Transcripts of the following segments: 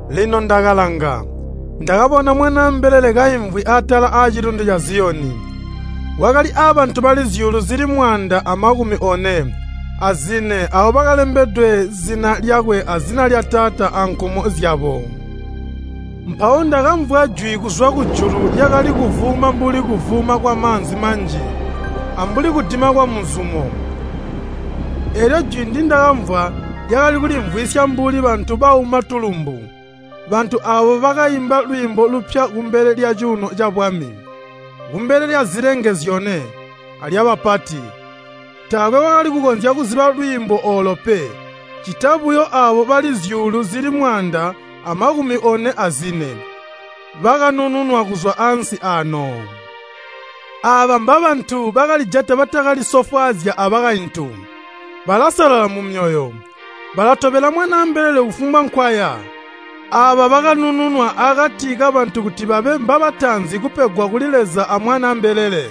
Lino ndakalanga, ndakabona Mwanaa mbelele kaimvwi atala aacilundu ca Ziyoni, wakali abantu bali zyuulu zili mwaanda amakumi one azine aabo bakalembedwe zina lyakwe azina lya Taata ankumo zyabo. Mpawo ndakamvwa jwi kuzwa kujulu lyakali kuvuuma mbuli kuvuuma kwamaanzi manji, ambuli kudima kwamuzumo. Eelyo jwi ndindakamvwa lyakali kulimvwisya mbuli bantu bauma tulumbu. Bantu aabo bakaimba lwiimbo lupya kumbele lyacuuno cabwami, kumbele lyazilenge zyone, alyabapati. Taakwe wakali kukonzya kuziba lwiimbo oolo pe, ccita buyo aabo bali zyuulu zili mwaanda amakumi one azine bakanununwa kuzwa ansi aano. Aaba mbabantu bakalijata batakalisofwaazya abakaintu, balasalala mumyoyo. Balatobela Mwanaa mbelele kufumbwa nkwaya. Aaba bakanununwa akati kabantu kuti babe mbabataanzi kupegwa kuli Leza a Mwanaa mbelele.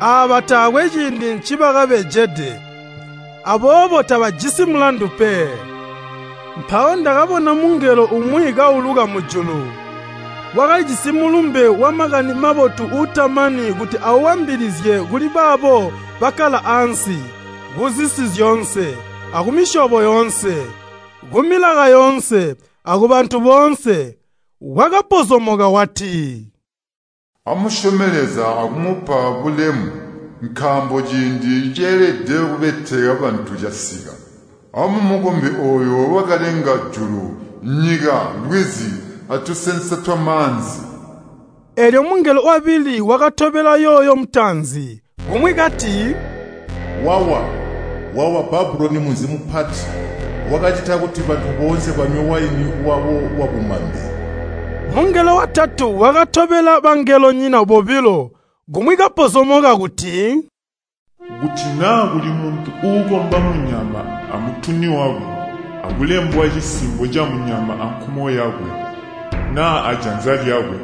Aaba taakwe ciindi ncibakabejede. Aboobo tabajisi mulandu pe. Mpawo ndakabona mungelo umwi kauluka mujulu. Wakalijisi mulumbe wa Makani Mabotu uutamani kuti awaambilizye kuli baabo bakkala ansi, kuzisi zyoonse, akumisyobo yoonse, kumilaka yoonse, akubantu boonse. Wakapozomoka wati, “Amusyome Leza akumupa bulemu, nkaambo ciindi nceelede kubeteka bantu casika! Amumukombe ooyo wakalenga julu, nyika, lwizi, atusensa twamaanzi!” Eelyo mungelo wabili wakatobela yooyo mutaanzi, kumwi kati, “Wawa, wawa Babuloni munzi mupati! Wakacita kuti bantu boonse banywe waini wawo wabumambe!” Mungelo watatu wakatobela bangelonyina bobilo, kumwi kapozomoka kuti, “Kuti naa kuli muntu uukomba munyama amutuni wakwe, akulembwa cisimbo camunyama ankumo yakwe naa ajanza lyakwe,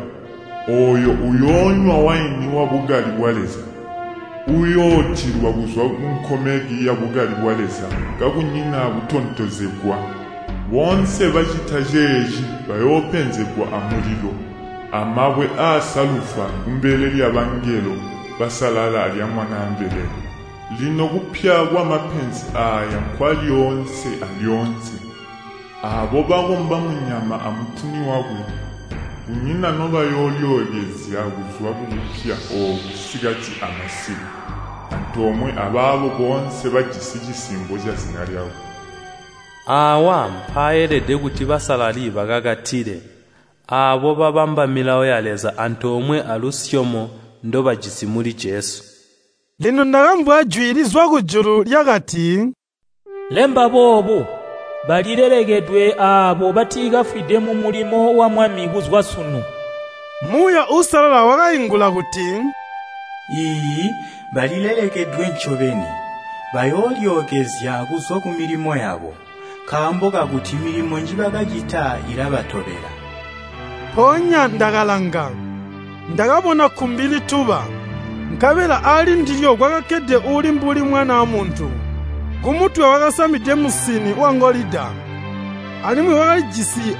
ooyo uyoonywa waini wabukali bwa Leza, uuyootilwa kuzwa munkomeki yabukali bwa Leza kakunyina akutontozegwa. Boonse bacita ceeci bayoopenzegwa amulilo amabwe aasalufa kumbele lyabangelo basalala alya Mwanaa mbelele. Lino kupya kwamapenzi aaya nkwalyoonse alyoonse. Aabo bakomba munyama amutuni wakwe kunyina nobayoolyookezya kuzwa kukupya ooku sikati amasiku, antoomwe abaabo boonse bajisi cisimbo cazina lyakwe.” Aawa mpaaelede kuti basalali bakakatile, aabo babamba milawo ya Leza antoomwe alusyomo ndobajisi muli Jesu. Lino ndakamvwa jwi lizwa kujulu, lyakati, “Lemba boobu: Balilelekedwe aabo batikafwide mumulimo wa Mwami kuzwa sunu!” Muuya Uusalala wakaingula kuti, “Iiyi, balilelekedwe ncobeni! Bayoolyookezya kuzwa kumilimo yabo, nkaambo kakuti milimo njibakacita ilabatobela.” Mpoonya ndakalanga, ndakabona kkumbi lituba, nkabela alindilyo kwakakkede uuli mbuli Mwanaa Muntu. Kumutwe wakasamide musini wangolida, alimwi wakalijisi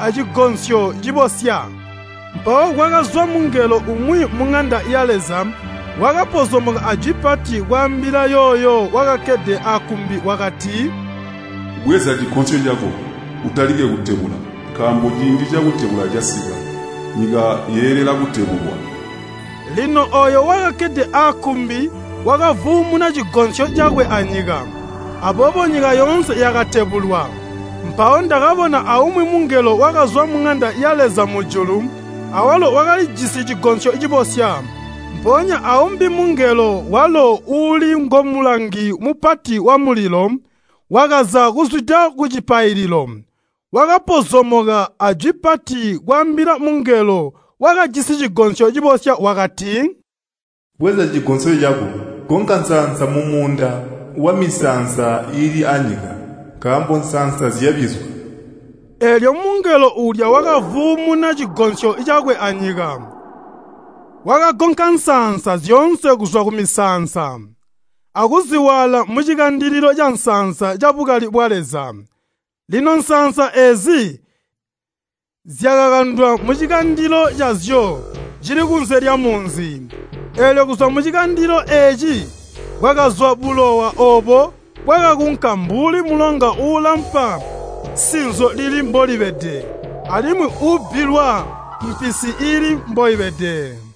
acigonsyo cibosya. Mpawo kwakazwa mungelo umwi muŋanda ya Leza wakapozomoka ajwi pati kwaambila yooyo wakakkede akkumbi wakati, “Bweza cigonsyo cako, utalike kutebula, nkaambo ciindi cakutebula casika, nyika yeelela kutebulwa.” Lino ooyo wakakkede akkumbi wakavuumuna cigonsyo cakwe anyika, aboobo nyika yoonse yakatebulwa. Mpawo ndakabona aumwi mungelo wakazwa muŋanda ya Leza mujulu, awalo wakalijisi cigonsyo cibosya. Mpoonya aumbi mungelo walo uuli ngomulangi mupati wamulilo, wakaza kuzwida kucipaililo. Wakapozomoka ajwi pati kwaambila mungelo wakajisi cigonsyo cibosya, wakati, “Bweza cigonsyo cako, gonka nsaansa mumuunda wamisaansa iili anyika, nkaambo nsaansa zyabizwa!” Eelyo mungelo uulya wakavuumuna cigonsyo cakwe anyika, wakagonka nsaansa zyoonse kuzwa kumisaansa, akuziwaala mucikandilo cansaansa cabukali bwa Leza. Lino nsaansa eezi zyakakandwa mucikandilo cazyo cili kunze lyamunzi, eelyo kuzwa mucikandilo eeci kwakazwa bulowa oobo bwakakunka mbuli mulonga uulampa sinzo lili mbolibede alimwi uubbilwa mpisi iili mboibede.